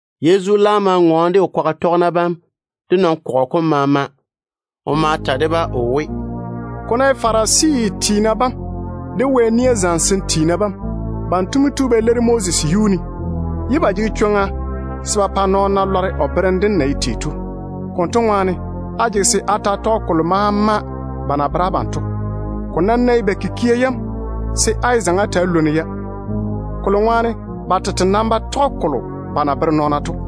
Yezu laam ma ŋɔɔne de o kwaga tɔgena bam de nɔn-kɔgɔ kom maama. O ma ta de-ba o we, “Ko ná ye Farisi tiina bam de Wɛ nia zamesem tiina bam, banto mo tu ba leiri Moses yuu ne, ye ba jege chwoŋa se ba pa nɔɔna lɔre o berem dem kuri. Konto ŋwaane, á jege se á ta‑á tɔge kolo maama ba na bere abam to. Ko nam ná ye ba kikia yam, se á yé zaŋe á ta‑á lwoni-ya, kolo ŋwaane ba tete nam ba tɔge kolo ba na bere nɔɔna to.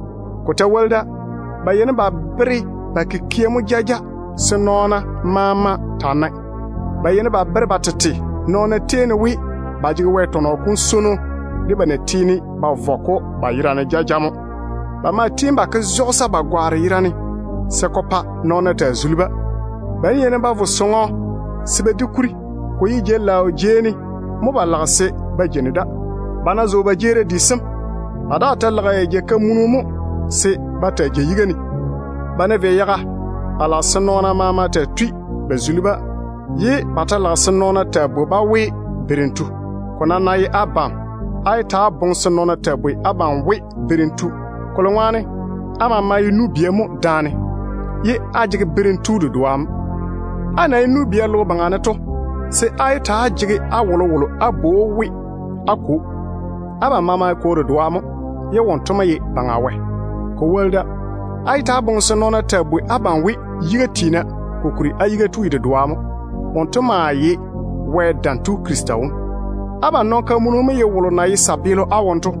Ko ta woli da, ba yeini ba bere ba kikia mo jaja se nɔɔna maama taa nae. Ba yeini ba bere ba tete nɔɔna tei ne we ba jege Wɛ tɔnɔ kom swono, de ba na tiini ba vɔ-ko ba yera ne jaja to. Ba maa tiini ba ke zɔla ba gwaaro nia ne se ko pa nɔɔna taa nege-ba. Ba ná yeini ba vo nɔɔno sɔŋɔ se ba di kuri, ko ye jei-laao jei ne mo ba lage se ba taa jei da. Ba ná zo ba jeerim di sem, ba daa ta lage jei-kamunu mo se ba jeini yiga ne. Ba ná vei yaga, ba lage se nɔɔna maama taa tui ba tei-ba mo, ye ba ta lage se nɔɔna taa bwoi-ba we ‘Berem tu’. Ko nam ná ye abam, á yé ta‑á boŋe se nɔɔna taa bwoi abam we ‘Berem tu’, kolo ŋwaane á maama ye nu-bia mo daane, ye á jege Berem Tu dedoa mo. Á na ye nu-bia logo baŋa ne to, se á yé ta‑á jege á wolowolo á bwoi we á kwo. Abam maama ye Kwo dedoa mo. Wonto ye Baŋa Wɛ mo. Ko woli da, á yé ta‑á boŋe se nɔɔna taa bwoi abam we ‘Yiga tiina’, kokuri á Yiga tu ye dedoa mo. Wonto maa ye Wɛ Dam Tu Krista wom. Abam nɔn-kamunu mo ye wolo na ye tontoŋeno á wone to.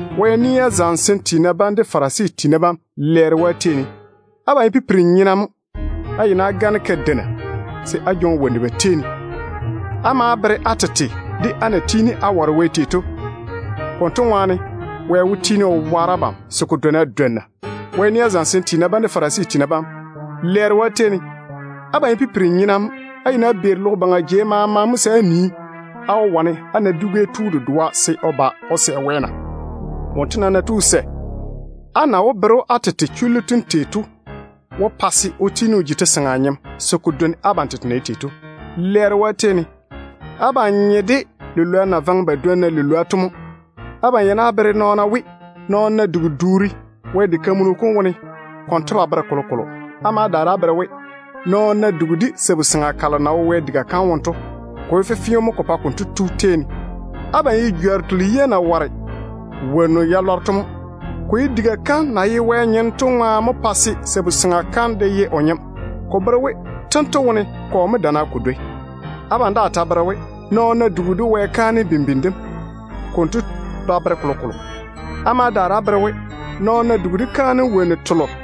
Wɛ nia zamesem tiina bam de Farisi tiina bam, lɛɛro yi abam! Abam ye pipiri-nyena mo. Á yeini á gane kadeina se á jwoŋi wonnu ba tei ne. Á maa bere á tete de á na tiini á ware Wɛ tei to. Konto ŋwaane Wɛ wó tiini o waare abam se ko dwoni á dwonna.] Wɛ nia zamesem tiina bam de Farisi tiina bam, lɛɛro yi abam! Abam ye pipiri-nyena mo. Á yeini á beeri logo jei maama mo se á nii, á wó wane á na dwi-gɛ tu dedoa se o ba o sɛ Wɛ na. Wonto nam ná tu o sɛ, á maa wó bere‑o á tete chullu tem pa se o tiini o ji te-seŋa nyem se ko dwoni abam tete na ye tei to. Lɛɛro yi abam! Abam nye de lilwoa na vaŋe ba dwonna lilwoa to mo. Á yeini á bere nɔɔna we, nɔɔno ná dugi duuri Wɛ diga kam ŋwaane, konto ba bere kolokolo. Á ma daare á bere we, nɔɔno nam ná dugi de sabu-seŋa kalo na wo Wɛ diga kam wone to, ko ye fefeo mo konto tu tei ne. Abam ye jworru telo yia na ware wonnu ya lɔre to mo. Ko ye diga kam na ye Wɛ tete nyem to ŋwaane mo pa se sabu-seŋa kam de ye o nyem. Ko bere we tento wone kɔ mo damma ko dwoi? Abam daa ta bere we, nɔɔno ná dugi de Wɛ kaanem bimbini dem, konto ba bere kolokolo. Á ma daare á bere we, nɔɔno ná dugi de pɛɛra yalo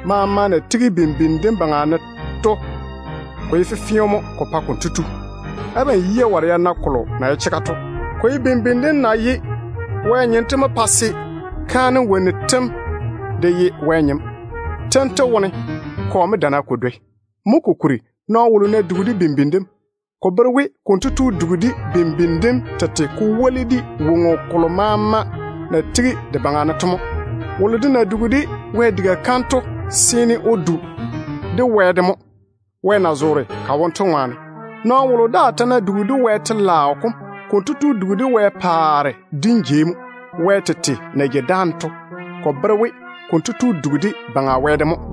maama na tigi bimbini dem baŋa ne to, ko ye fefeo mo ko pa konto tu. Abam yia ware ya na kolo na ye chega to. Ko ye bimbini dem na ye Wɛ nyem to mo pa se pɛɛra yam de ye Wɛ nyem. Tento wone kɔ mo damma ko dwoi? Mo kokuri, nɔɔno wolo ná dugi de bimbini dem, ko bere we konto tu dugi de bimbini dem tete ko woli de woŋo kolo maama na tigi de baŋa ne to mo. Wolo de na dugi de Wɛ diga kam to seene o du de Wɛ tete de mo, Wɛ na zoore ka wone to ŋwaane. Nɔɔno wolo daa ta ná dugi de Wɛ telaao kom, konto tu dugi de Wɛ paare dim jei mo. Wɛ tete na jeini dáane to, ko bere we konto tu dugi de Baŋa Wɛ de mo.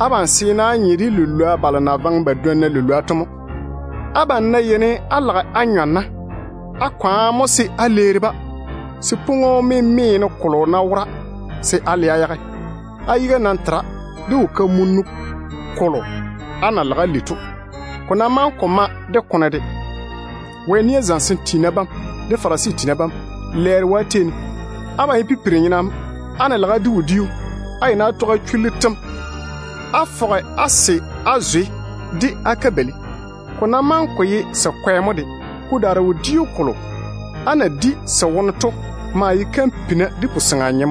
Abam seene á nye de lilwoa balo na vaŋe ba dwonna lilwoa to mo. Abam ná yeini á lage á nyɔ na, á kwaane mo se á leeri-ba, se pwoŋo-memeeno kolo ná wora, se á le-ko á yage. Á yiga nam tera de wo-kamunu kolo á na lage á li to, ko ná maŋe ko ma de kone de. Wɛ nia zamesem tiina bam de Farisi tiina bam, lɛɛro yi abam! Abam ye pipiri-nyena mo. Á ná lage á di wodiu, á yeini á tɔge á chullu tem á fɔge á se á na-zwe de á kabeili, ko ná maŋe ko ye se kwɛ mo de. Ko daare wodiu kolo á na di se wone to maa ye kampina de puseŋa.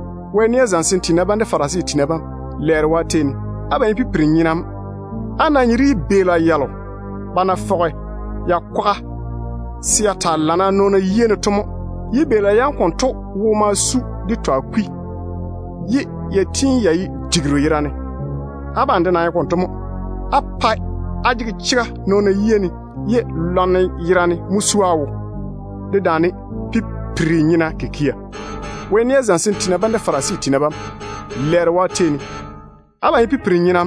Wɛ nia zamesem tiina bam de Farisi tiina bam, lɛɛro yi abam! Abam ye pipiri-nyena mo. Á nye de yibeela yalo ba na fɔge ya kwaga se ya taa lamma nɔɔna yia ne to mo. Yibeela yam konto wo ma su de twa kwi, ye ya tiini ya ye digiru yerane. Abam de nam ye konto mo. Á pae á jege chega nɔɔna yia ne, ye lwarem yerane mo su á wo, dedaane pipira kikia. Wɛ nia zamesem tiina bam de Farisi tiina bam, lɛɛro yi abam! Abam ye pipiri-nyena.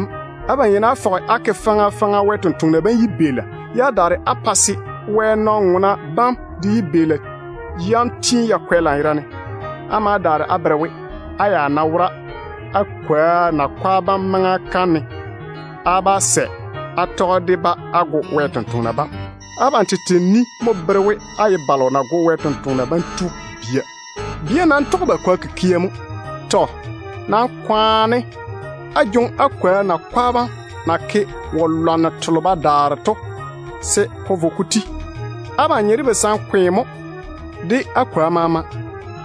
Á yeini á fɔge á ke faŋa faŋa Wɛ sampwori sem yibeela, ye á daare á pa se nɔn-ŋona bam de yibeela yam tiini ya kwɛ lanyerane. Á ma daare á bere we, á ya ná wora á kwoa nakwa bam maŋa kam ne, á bá sɛ á tɔge de-ba á go Wɛ sampwori sem. Abam tete ni mo bere we á ye balo na go Wɛ sampwori sem to bia. Bia nam tɔge ba kwoa kikia mo. Tɔ. Nam kwaane á toŋe á kwoa nakwa bam na ke wo-lwanno telo ba daare to se ko vo ko ti. Abam nye de basankwe mo de á kwoa maama.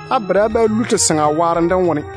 Á bere á bá lu te-seŋa waarem dem wone.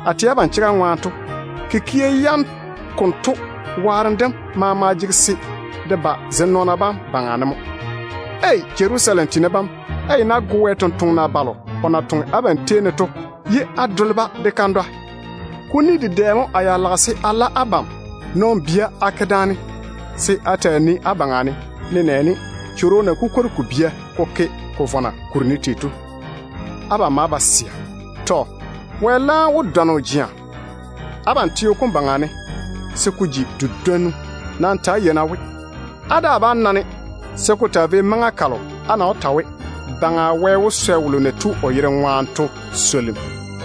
A tɛ abam chega ŋwaane to, kikia yam konto waarem dem maama jege se de ba zem nɔɔna bam baŋa ne mo. Ei! Jerusalem tiina bam, á yeini á go Wɛ sampwori selo o na toŋe abam tei ne to ye á dole-ba de kandwa. Kuni dedɛ mo a ya lage se a la abam nɔn-bia a ke daane se a taa nii á baŋa ne, nenɛɛne chworo na kukwori ko bia ko ke ko vɔna kuri ne tei to. Abam maa ba sɛa. Tɔ. Wɛ laam wó dɔne o je abam teo kom baŋa ne se ko ji di-dwonnu. Nam ta‑á yei-na we, á daa bá na-ne se ko taa vei maŋa kalo á na wó ta we, ‘Dé Teiru Wɛ wó swɛ wolo na tu o yere ŋwaane to swolim.’”